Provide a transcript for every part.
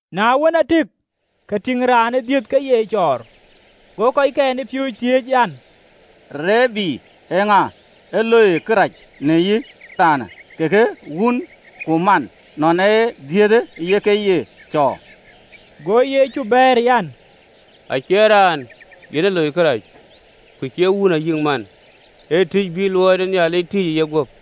Na wën, aa tëëk, ke tïŋ raan ë dhiëth ke ye cɔɔr. Go kɔckɛn ë piööcë thiëëc an, “Rabi, eeŋa ë loi kërac, në yï raanë, kekë wun ku man, ënɔɔn ë dhiëthë ye ke ye cɔɔr?” Go Yecu bɛ̈ɛ̈r an, “Acie raanë yen ë loi kërac, ku cie wun ayï man: ee tïc bï luɔi ë Nhialic tïc ë yeguöp.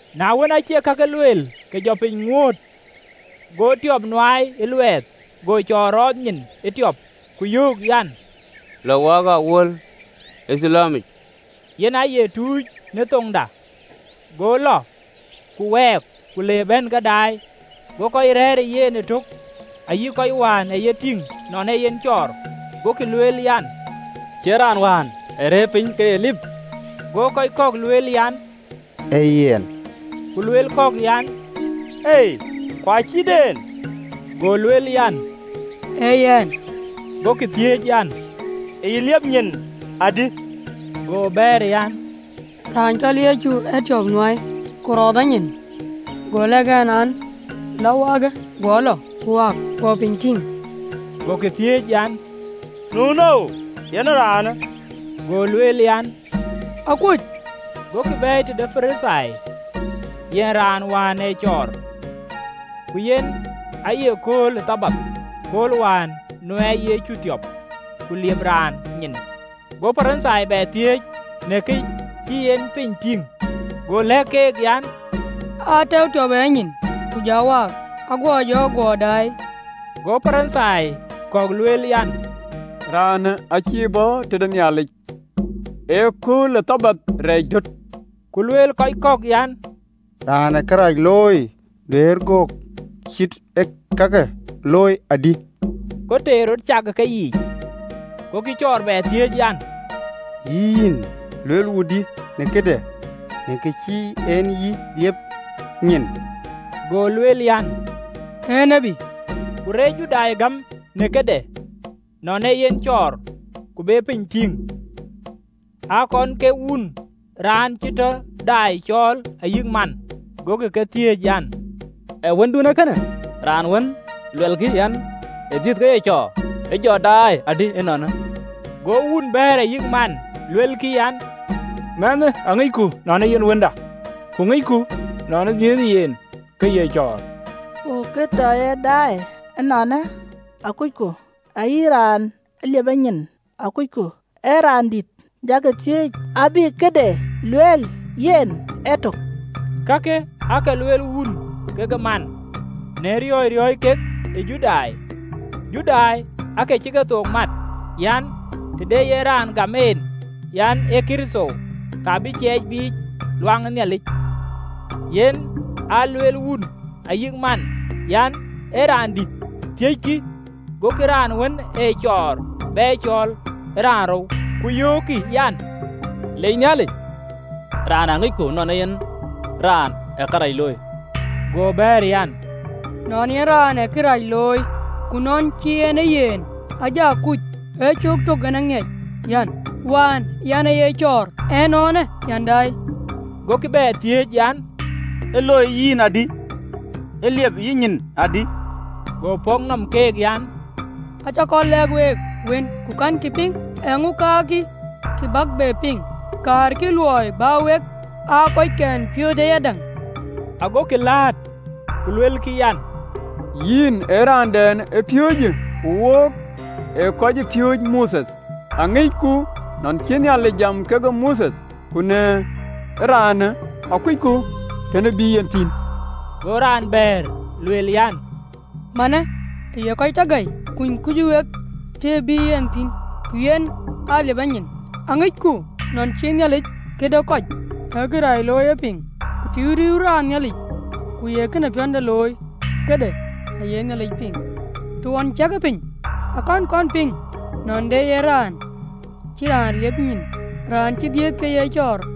Na wën, aacï kakë lueel, ke jɔ piny ŋuööt, go tiɔp nuaai ë luɛɛth, go cɔɔr rɔɔth nyin ë tiɔp, ku yöök an, “Lɔ, waakë ë awuöl e Thilowamic (yen aye “Tuc” në thoŋda).” Go lɔ, ku wɛɛk, ku le bɛ̈n ke daai. Go kɔc rɛ̈ɛ̈r ë yen ëtök, ayï kɔc wään ee ye tïŋ nɔn ee yen cɔɔr, agokï lueel an, “Cie raan wään ee rëër piny ke lip?” Go kɔc kɔ̈k lueel an, “Ee yen.” Ku lueel kɔ̈k an, “Ei, ku acït en.” Go raan jɔ lueel an, “Ee yɛn.” Gokï thiëëc an, “Ë yï liep nyin adï?” Go bɛ̈ɛ̈r an, “Raan cɔl Yecu ë tiɔp nuaai, ku rɔɔth a nyin, go lɛ̈k ɛn an, Lɔ waakë ë Thilowamic: guɔ lɔ, ku waak, guɔ piny tïŋ.” Gokï thiëëc an, “Nu nou yen ee raanë?” Go lueel an, “Akuöc.” Gokï bɛ̈ɛ̈i tëde Parithai yen raan wään ee cɔɔr. Ku yen aaye kööl ë Thabath kööl wään nuɛɛiyë Yecu tiɔp, ku liep raan nyin. Go Parithai bɛ thiëëc në kë cï en piny tïŋ. Go lëk keek an, “Aa tɛ̈ɛ̈u tiɔp ë yanyin, ku ja waak, aguɔ jɔ guɔ daai.” Go Parithai kɔ̈k lueel an, “Raanë aacïï bɔ̈ tëde Nhialic, ee kööl ë Thabath rɛɛc döt.” Ku lueel kɔc kɔ̈k an, “Raan ë kërac looi duëër göök cït ë kakë looi adï?” Go teer rɔt cak ë keyiic. Gokï cɔɔr bɛ thiëëc an, “Yïn, luel wudï në këde, në kë cï en yï liep nyin?” Go lueel an, “Ee tiët.” Ku reec Judai gäm në këde, nɔn ee yen cɔɔr, ku be piny tïŋ, agokï wun ku man raan wën cï tɔ daai cɔɔl. Ku thiëckï keek an, “Ee wëndun ee kënë, raan wën luɛlkï an, ë dhiëth ke ye cɔɔr? E jɔ daai adï ënɔɔnë?” Go wun bɛ̈ɛ̈r ayï man, luelkï an, “Mɛnhë aŋicku nɔn ee yen wënda, ku ŋicku nɔn ë dhiëëthë yen ke ye cɔɔr. Ku kë tɔ ye daai ënɔɔnë akucku, ayï raan ë liep yenyin, akucku, ee raan dït, jakï thiëëc, abï këde lueel yen ëtök!” Kakë aake lueel wun kekë man, në riɔ̈ɔ̈c riɔ̈ɔ̈c kek ë Judai: Judai aake cï kethook mat an, të de yen raan gam en an, ee Kërtho, ka bï ciɛɛc biic ɣön ë Nhialic. Yen aa lueel wun ayï man an, “Ee raan dït, thiëckï!” Gokï raan wën ee cɔɔr bɛ cɔɔl raanrou, ku yöökkï an, “Leec Nhialic, raanë aŋicku nɔn ee yen raan ë kërac looi.” Go bɛ̈ɛ̈r an, “Nɔn ee yen raan ee kërac looi, ku nɔn cïï en ee yen, aa ja kuc: ee cöök tök yen aŋiɛc an, wään yɛn aaye cɔɔr, ënɔɔnë yɛn daai.” Gokï bɛ thiëëc an, “Ë loi yïn adï? Ë liep yïnyin adï?” Go pɔ̈k nɔm keek an, “Acä kɔn lɛ̈k week wën, ku kɛ̈nkï piŋ: eeŋö kaarkï, kë bäk bɛ piŋ? Kaarkï luɔi bä wek aa kɔckɛn ë piööcë ayadäŋ?” Agokï lat, ku luelkï an, “Yïn ee raandɛn ëpiööcë, ku wok ee kɔcpiööcë Mothe. Aŋicku nɔn cï Nhialic jam kekë Mothe, ku na ye raanë, akucku tëdɛn ë bï yen thïn!” Go raan bɛ̈ɛ̈r, lueel an, “Man ee kë ye kɔc tɔ gäi, kuny kuöc wek të ë bï yen thïn, ku yen aa liep a nyin. Aŋicku nɔn cïï Nhialic këde kɔc ee kërac looi ye piŋ: ku të riëëuwë raan Nhialic, ku ye këde piɔ̈nde looi, këde aye Nhialic piŋ. Të ɣɔn ciɛkë piny akënë kɔn piŋ nɔn de yen raan cï raan liep nyin raan cï dhiëth ke ye cɔɔr.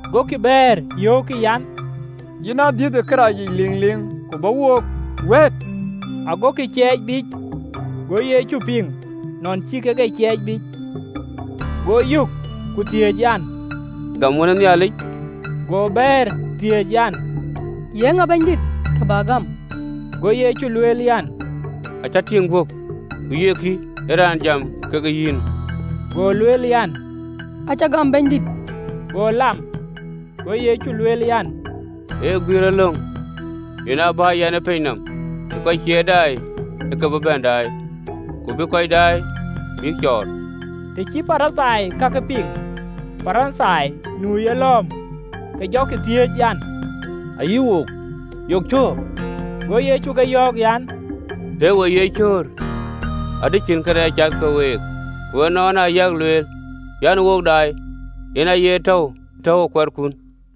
Gokï bɛ̈ɛ̈r yöökkï an, “Yïn aa dhiëth ë këracic liŋliŋ, ku bä wook wɛ̈ɛ̈t?” Agokï ciɛɛc biic. Ago Yecu piŋ nɔn cï kek e ciɛɛc biic, go yök, ku thiëëc an, “Gam Wën ë Raan?” Go bɛ̈ɛ̈r, thiëëc an, “Ye ŋa, Bɛ̈nydït, kë bän e gam?” Go Yecu lueel an, “Acï tïŋ guöp, ku ye kï, ee raan jam kekë yïnë.” Go lueel an, “Acä gam, Bɛ̈nydït.” Go lam. Go Yecu lueel an, “Ee guiëërëlöŋ yen aa bïï yɛn ë piny nɔm, ke kɔc cie daai ë ke bï bɛ̈n daai, ku bï kɔc daai bïk cɔɔr.” Të cï Parithai kakë piŋ, Parithai nu ë yelɔ̈ɔ̈m, ke jɔkï thiëëc an, “Ayï wook, yok cöör?” Go Yecu ke yɔ̈ɔ̈k an, “Tëë we ye cöör, adï cïn awäny cath ke week: ku ënɔɔnë ayak lueel an, Wok daai, yen aye täu tɔ̈uwë awänydun.”